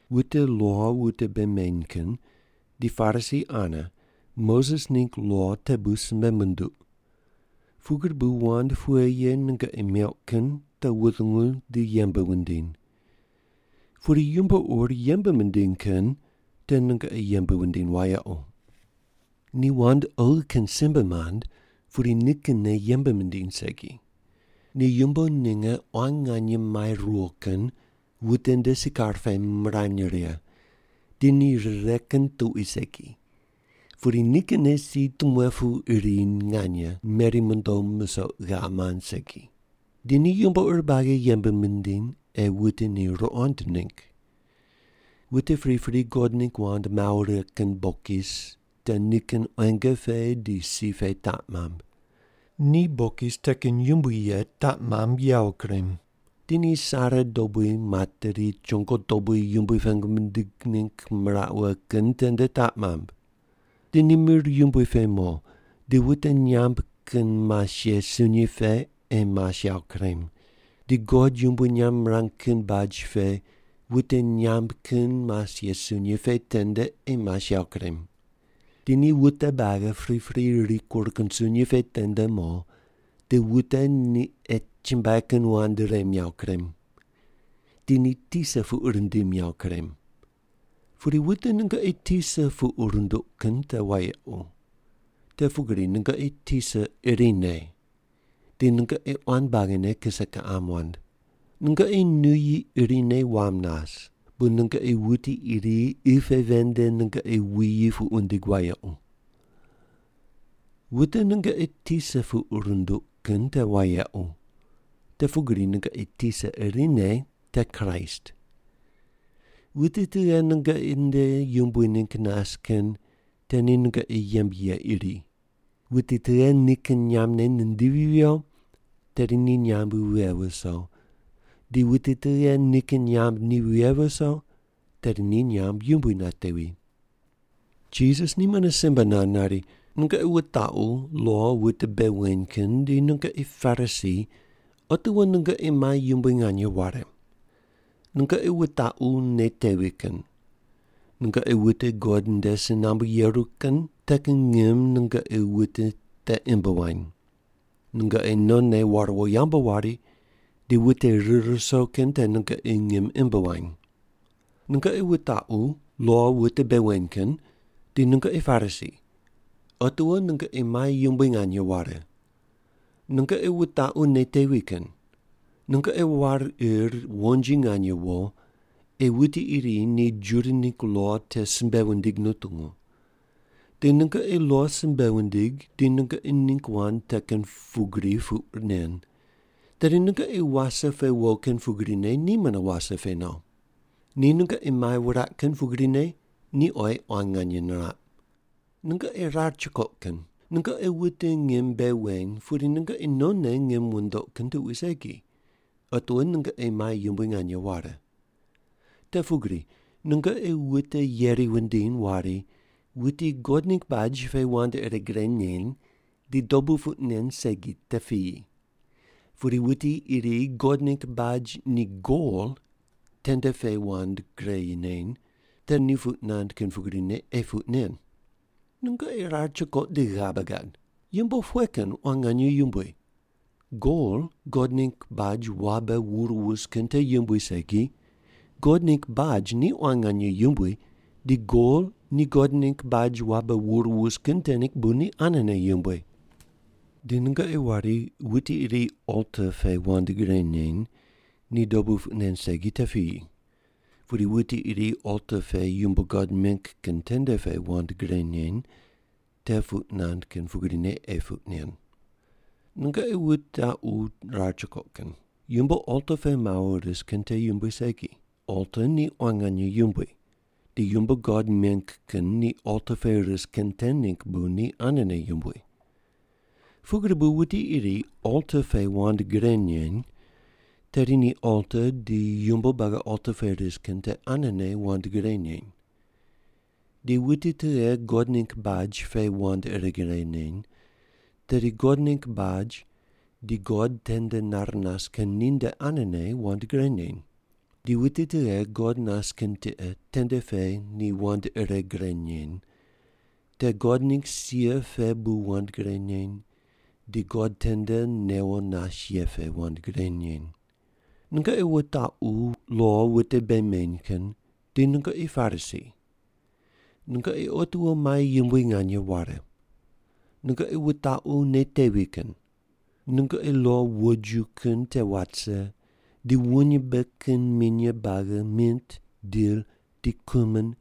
“Wute lo wute bei meny kin di Parisi ane Moses ningg lo te bu simbe munduq. Pugri bu wand pughe ye nungoqi meuq kin te wutungu di yembe wundiny. Pudi yumbo ur yembe mindiny kin te nungoqi yembe wundiny wayequ. Ni wand oghi kin simbe mand pudi nikinne yembe mindiny segi. Ni yumbo ninge quan nganye mai ruwo kin wute nde sikar pe mirany righe, di ni rire kin tuqui segi. Pudi nikinne si timuepu iri nganye meri mondo musoq ghav mand segi. Di ni yumbo ur buagi yembe mindiny ei wute ni ruqond ningg. Wute pripri God ningg wand mawo righe kin bokis te nikin quenge pe di si pe taq mamb. Ni bokis te kin yumbui ye taq mamb yawo kurem. Di ni sare dobui materi chongo dobui Yumbui pengu mindig ningg miraq wughe kin tende taq mamb. Di ni mir yumbui pe mo di wute nyamb kin mas ye sunyi pe ei mas yawo kurem, di God yumbui nyamb mirang kin baj pe wute nyamb kin mas ye sunyi pe tende ei mas yawo kurem. Di ni wute buagi pripri rikur kin sunyi pe tende mo di wute ni ei chumbuai kin wand rem yawo kurem. Di ni tisa puq rindim yawo kurem. “Pudi wute nungoqi tisa puq runduq kin te wayequ, te pugri nungoqi Tisa irine, di nungoqi quan buagine kise kiqam wand. Nungoqi nuyi irine wam nas, bu nungoqi wuti iri qi pe ven nde nungoqi wuyi puq wundig wayequ. Wute nungoqi tisa puq runduq kin te wayequ, te pugri nungoqi tisa irine te Kraist. Wuti tughe nungoqi nde yumbui ningg nas kin te ni nungoqi yembe ye iri. Wuti tughe nikin nyambne nindivi viyo, tedi ni nyamb vighe viso, di wuti tughe nikin nyamb ni vighe viso, tedi ni nyamb yumbui natevi.” Jisas ni mune simbe nand nari, “Nungoqi wutaqu lo wute bei weny kin di nungoqi Parisi otiwo nungoqi mai yumbui nganye ware. Nungoqi wutaqu nei tevi kin. Nungoqi wute God nde si nambu yeru kin te kin ngim nungoqi wute te imb wany. Nungoqi nonne war wo yambu wari, di wute rir ruso kin te nungoqi ngim imb wany. “Nungoqi wutaqu lo wute bei weny kin di nungoqi Parisi otiwo nungoqi mai yumbui nganye ware. Nungoqi wutaqu nei tevi kin. Nungoqi war ir wonji nganye wo, ei wuti iri ni Juda ningg lo te simbe wundig nutungu. Di nungoqi lo simbe wundig di nungoqi ningg wand te kin pugri puq nen, tedi nungoqi wase pe wo kin pugrine ni mune wase pe no. Ni nungoqi mai wuraq kin pugrine ni oyi quan nganye niraq. “Nungoqi rar chukoq kin, nungoqi wute ngim bei weny pudi nungoqi nonne ngim wundoq kin tuqui segi, otiwo nungoqi mai yumbui nganye ware. Te pugri nungoqi wute yeri wundiny wari, ‘Wuti God ningg baj pe wand ire gre neny, ni dobu puq nen segi te piyi. Pudi wuti iri God ningg baj ni gol tende pe wand gre neny, te ni puq nand kin pugrine ei puq nen.’ Nungoqi rar chukoq di ghabe gad! Yumbo pughe kin quan nganye yumbui? Gol God ningg baj wabe wur wus kin te yumbui segi, God ningg baj ni quan nganye yumbui di gol ni God ningg baj wabe wur wus kin te ningg bu ni anene yumbui. Di nungoqi wari, ‘Wuti iri alta pe wand gre neny, ni dobu puq nen segi te piyi. Pudi wuti iri alta pe yumbo God meng kin tende pe wand gre neny, te puq nand kin pugrine ei puq nen.’ Nungoqi wutaqu rar chukoq kin. Yumbo alta pe mawo ris kin te yumbui segi. Alta ni quan nganye yumbui, di yumbo God meng kin ni alta pe ris kin te ningg bu ni anene yumbui. Pugri bu wuti iri alta pe wand gre neny, tedi ni alta di yumbo buagi alta pe ris kin te anene wand gre neny. Di wuti tughe God ningg baj pe wand ire gre neny, tedi God ningg baj di God tende nar nas kin ninde anene wand gre neny. Di wuti tughe God nas kin tiqe tende pe ni wand ire gre neny, te God ningg sia pe bu wand gre neny, di God tende newo nas ye pe wand gre neny. “Nungoqi wutaqu lo wute bei weny kin di nungoqi Parisi, nungoqi otiwo mai yumbui nganye ware. Nungoqi wutaqu nei tevi kin. Nungoqi lo wojiju kin te wat rise di wuny mbe kin minye buagi mint, dil, di kumin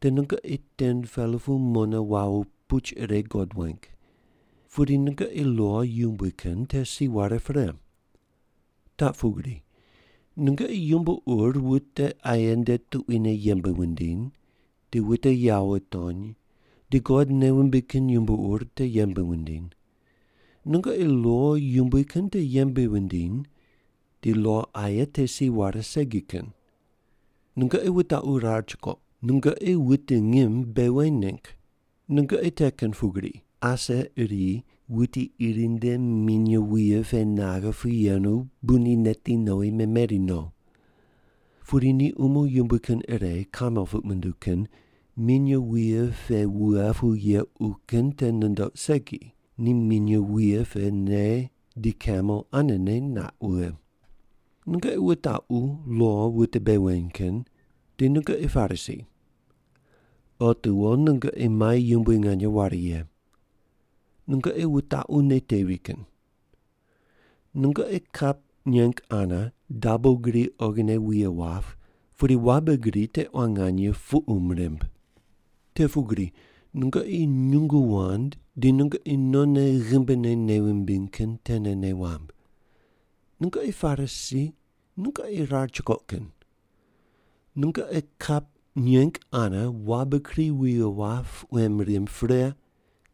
te nungoqi 10-pela pu mone wawo puch ire God weng. Pudi nungoqi lo yumbui kin te si ware pre. Taq pugri, nungoqi yumbo ur wute aye nde tuquine yembe wundiny, di wute yawo wutony, di God nei wumbig kin yumbo ur te yembe wundiny. Nungoqi lo yumbui kin te yembe wundiny, di lo aye te si ware segi kin. Nungoqi wutaqu rar chukoq, nungoqi wute ngim bei weny ningg! Nungoqi te kin pugri, ase iri wuti iri nde minye wuye pe naghe pu yenu bu ni neti nowi meneri no. Pudi ni umo yumbui kin ire, kamel puq munduw kin, minye wuye pe wughe pu yequ kin te nundoq segi, ni minye wuye te ne di kamel anene naq wughe. “Nungoqi wutaqu lo wute bei weny kin di nungoqi Parisi, otiwo nungoqi mai yumbui nganye ware ye! Nungoqi wutaqu nei tevi kin. Nungoqi kap nyeng ane dabo gri oghine wuye wap, pudi wabe gri te quan nganye puqum rimb. Te pugri nungoqi nyungu wand di nungoqi non ghimbine nei wumbiny kin tene nei wamb. Nungoqi Parisi nungoqi rar chukoq kin! Nungoqi kap nyeng ane wabe gri wuye wap quem rimb pre,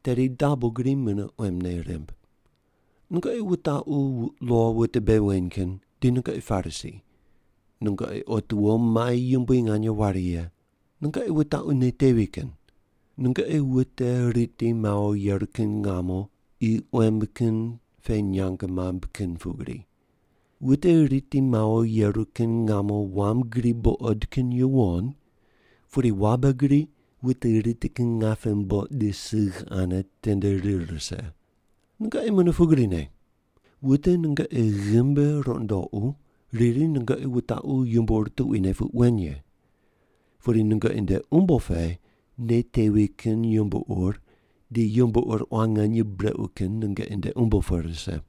tedi dabo gri mune quemne rimb. “Nungoqi wutaqu lo wute bei weny kin di nungoqi Parisi, nungoqi otiwo mai yumbui nganye ware ye. Nungoqi wutaqu nei tevi kin. Nungoqi wute riti mawo yeru kin ngamo qi quem kin pe nyang mamb kin pugri. Wute riti mawo yeru kin ngamo wam gri buqod kin yuwon, pudi wabe gri wute riti kin ngape mboq di sigh ane tende rir rise. Nungoqi mune pugrine. Wute nungoqi ghimbi rundoqu riri nungoqi wutaqu yumbo ur tuquine puq wen ye. Pudi nungoqi nde umbo pe nei tevi kin yumbo ur di yumbo ur quan nganye brequ kin nungoqi nde umbo pe rise.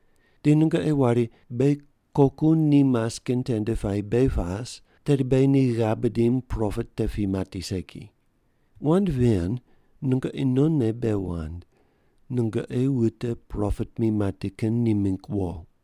Di nungoqi wari, ‘Beghi koku ni mas kin tende puayi beghi pas, tedi beghi ni ghav bidim propet te pi mati segi.’ Wand ven nungoqi nonne bei wand, nungoqi wute propet mi mati kin ni mingg wo.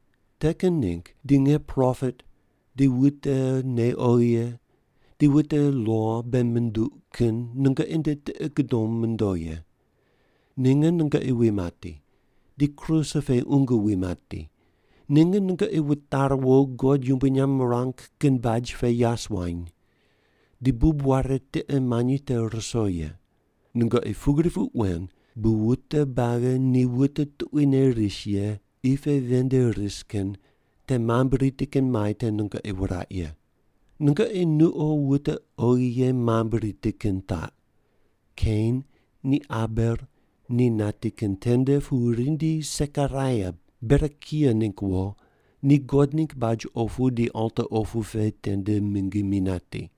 Te kin ningg di nge propet di wute nei oghi ye di wute lo bei munduq kin nungoqi nde tiqi gudom mondo ye. Ninge nungoqi wi mati, di kruse pe qungu wi mati, ninge nungoqi wutari wo God yumbui nyamb wurang kin baj pe yas wuany, di bub ware tiqe manyi te ruso ye. Nungoqi pugri puq wen bu wute buagi ni wute tuquine ris ye qi pe ven nde ris kin te mambui riti kin mai te nungoqi wuraq ye. Nungoqi nuqo wute oghi ye mambui riti kin taq, Kein ni Abel ni nati kin tende pu rindi Sekaraia, Berekia ningg wo, ni God ningg baj opu di alta opu di tende mingi mi nati.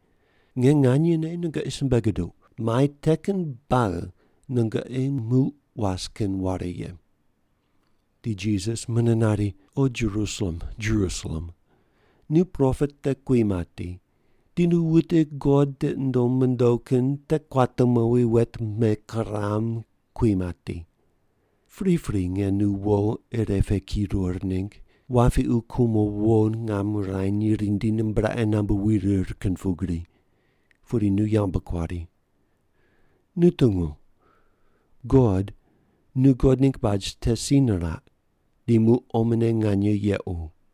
Nge nganyene nungoqi simbe guduq, mai te kin buagi nungoqi muq was kin ware ye.” Di Jisas mune nari, “O Jerusalem, Jerusalem, nu propet te kui mati, di nu wute God tiqi nundom mondo kin te kuate mowi wet mekuram kui mati. Pripri nge nu wo ire pe kirur ningg, wapiqu kumo wo ngam wurany rindi nimbraqe nambu wirir kin pugri, pudi nu yambu kuari. Nu tungu! God nu God ningg baj te si niraq di muq omone nganye yequ.